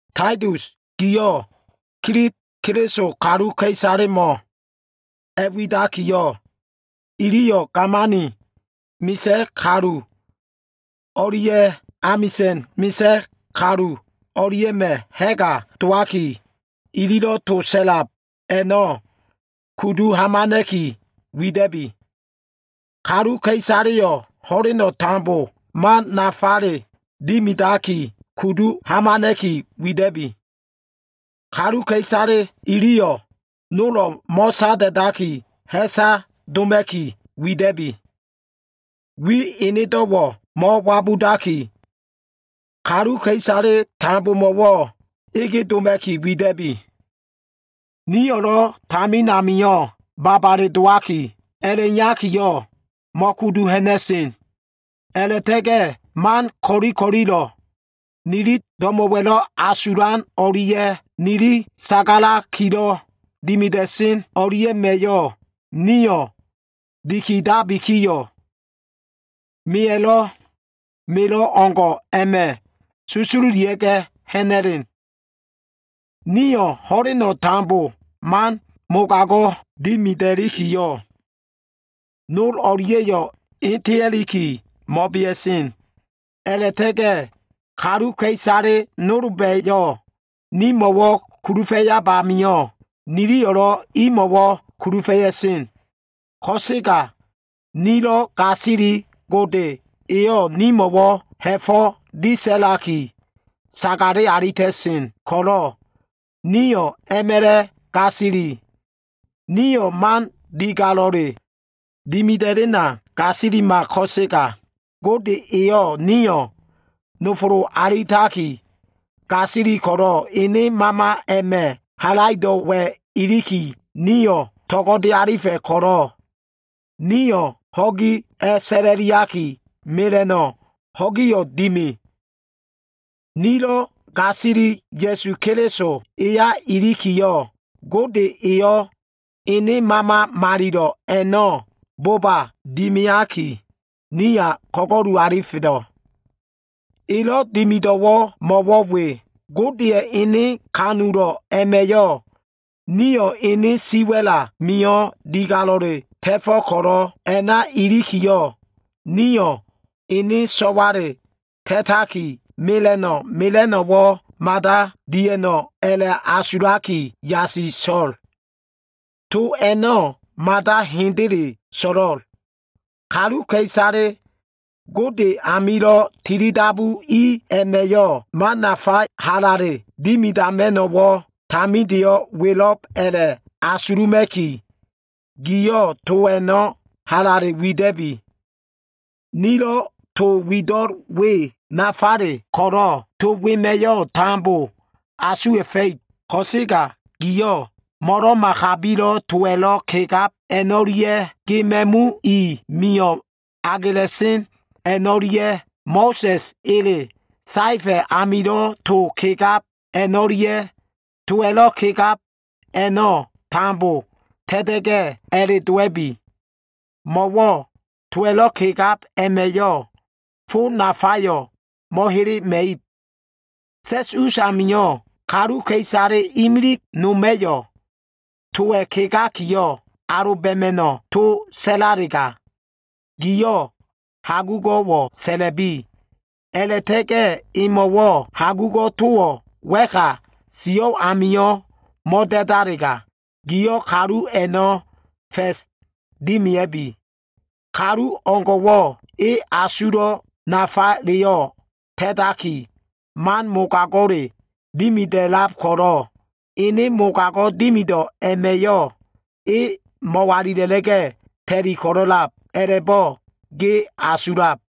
Taitus giyo꞉ Kilit Keliso kaluka꞉isalemo꞉ a꞉widakiyo꞉, iliyo꞉ gamani misa꞉ kalu o꞉lia꞉ amisa꞉na꞉ misa꞉ kalu o꞉lia꞉ma꞉ ha꞉ga dowaki, ililo꞉ to sa꞉lab a꞉no꞉ kudu hamana꞉ki wida꞉bi. Kaluka꞉isaleyo꞉ ho꞉leno꞉ tambo man nafa dimidaki kudu hamana꞉ki wida꞉bi. Kaluka꞉isale iliyo꞉ nolo꞉ mo꞉sada꞉daki, ha꞉sa doma꞉ki wida꞉bi. Wi enedo꞉wo꞉ mo꞉wabudaki, kaluka꞉isale tambomo꞉wo꞉ ege doma꞉ki wida꞉bi. Nio꞉lo꞉ tamin amio꞉ babale dowaki a꞉la꞉iyakiyo꞉ mo꞉kudu ha꞉na꞉sen. A꞉la꞉ta꞉ga꞉ man ko꞉li ko꞉lilo꞉, nili do꞉mo꞉wa꞉lo꞉ asulan o꞉lia꞉ nili sagalakilo꞉ dimida꞉sen a꞉no꞉lia꞉ma꞉yo꞉, nio꞉ dikidabikiyo꞉, meya꞉lo꞉ melo꞉ o꞉ngo꞉ a꞉ma꞉ susululia꞉ga꞉ ha꞉na꞉len. Nio꞉ ho꞉leno꞉ tambo man mogago꞉ dimida꞉likiyo꞉, nol o꞉lia꞉yo꞉ etea꞉liki mo꞉bea꞉sen. A꞉la꞉ta꞉ga꞉ kaluka꞉isale nolba꞉yo꞉ nimo꞉wo꞉ kulufa꞉yab amio꞉, niliyo꞉lo꞉ imo꞉wo꞉ kulufa꞉ya꞉sen. Ko꞉sega nilo꞉ gasili Gode eyo꞉ nimo꞉wo꞉ ha꞉fo꞉ disa꞉laki, sagale alita꞉sen ko꞉lo꞉ nio꞉ a꞉ma꞉la꞉ gasili. Nio꞉ man digalo꞉le dimida꞉lena gasilima. Ko꞉sega Gode eyo꞉ nio꞉ nofolo alitaki, gasili ko꞉lo꞉, ene Mama a꞉ma꞉ halaido꞉wa꞉ ilikiyo꞉, nio꞉ to꞉go꞉de alifa꞉ ko꞉lo꞉, nio꞉ ho꞉gi a꞉sa꞉la꞉liaki, mela꞉no꞉ ho꞉giyo꞉ dimi. Nilo꞉ gasili, Ya꞉su Keliso eya ilikiyo꞉, Gode eyo꞉ Ene Mama Malilo꞉ a꞉no꞉ boba dimiaki, niya ko꞉go꞉lu alifelo꞉. Elo꞉ dimido꞉wo꞉ mo꞉wo꞉ we. Godeya꞉ ene kanulo꞉ a꞉ma꞉yo꞉ nio꞉ ene siwa꞉l amio꞉ digalo꞉le ta꞉fo꞉ ko꞉lo꞉, a꞉na ilikiyo꞉, nio꞉ ene so꞉wale ta꞉taki, mela꞉no꞉ mela꞉no꞉wo꞉ mada dia꞉no꞉ a꞉la꞉asulaki yasiso꞉l. To a꞉no꞉ hendele so꞉lo꞉l. Kaluka꞉isale Gode amilo꞉ tilidabu i a꞉ma꞉yo꞉ man nafa halale dimidama꞉no꞉wo꞉, tamindeyo꞉ welo꞉b a꞉la꞉asuluma꞉ki, giyo꞉ to a꞉no꞉ halale wida꞉bi. Nilo꞉ to wido꞉l we nafale ko꞉lo꞉, to wema꞉yo꞉ tambo asuwa꞉fa꞉ib. Ko꞉sega giyo꞉ mo꞉lo꞉ma kabilo꞉ towa꞉lo꞉ kegab a꞉no꞉lia꞉, ge ma꞉mu i mio꞉ agela꞉sen a꞉no꞉lia꞉, Mo꞉sa꞉sa꞉ ele saefa꞉ amilo꞉ to kegab a꞉no꞉lia꞉, towa꞉lo꞉ kegab a꞉no꞉ tambo ta꞉ta꞉ga꞉, a꞉le dowa꞉bi. Mo꞉wo꞉ towa꞉lo꞉ kegab a꞉ma꞉yo꞉ fo nafayo꞉ mo꞉helema꞉ib. Sa꞉s us amio꞉, kaluka꞉isale imilig noma꞉yo꞉ towa꞉ kegakiyo꞉ aloba꞉ma꞉no꞉ to sa꞉lalega, giyo꞉ hagugo꞉wo꞉ sa꞉la꞉bi. A꞉la꞉ta꞉ga꞉ emo꞉wo꞉ hagugo꞉ towo꞉ wa꞉ka sio꞉ amio꞉ mo꞉da꞉dalega, gio꞉ kalu a꞉no꞉ fa꞉s dimia꞉bi. Kalu o꞉ngo꞉wo꞉ e asulo꞉ nafaleyo꞉ ta꞉taki, man mogago꞉le dimida꞉lab ko꞉lo꞉, ene mogago꞉ dimido꞉ a꞉ma꞉yo꞉ e mo꞉walila꞉la꞉ga꞉ ta꞉li ko꞉lo꞉lab, a꞉la꞉bo꞉ ge asulo꞉.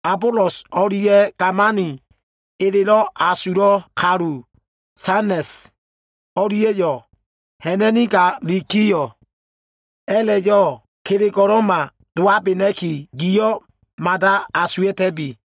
Abolos o꞉lia꞉ gamani elelo꞉ asulo꞉ kalu, Senas o꞉lia꞉yo꞉ ha꞉na꞉nigalikiyo꞉, a꞉la꞉yo꞉ kelego꞉lo꞉ma dowabena꞉ki, giyo꞉ mada asuwa꞉ta꞉bi.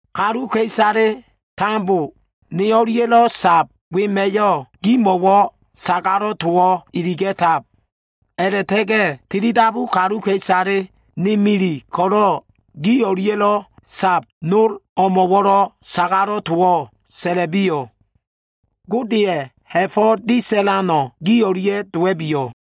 Kaluka꞉isale tambo ne o꞉lia꞉lo꞉ sab wema꞉yo꞉ gimo꞉wo꞉ sagalo꞉ towo꞉ iliga꞉tab. A꞉la꞉ta꞉ga꞉ tilidabu kaluka꞉isale, ne mili ko꞉lo꞉ gi o꞉lia꞉lo꞉ sab nol o꞉mo꞉wo꞉lo꞉ sagalo꞉ towo꞉ sa꞉la꞉biyo꞉. Godeya꞉ ha꞉fo꞉ disalano꞉ gi o꞉lia꞉ dowa꞉biyo꞉.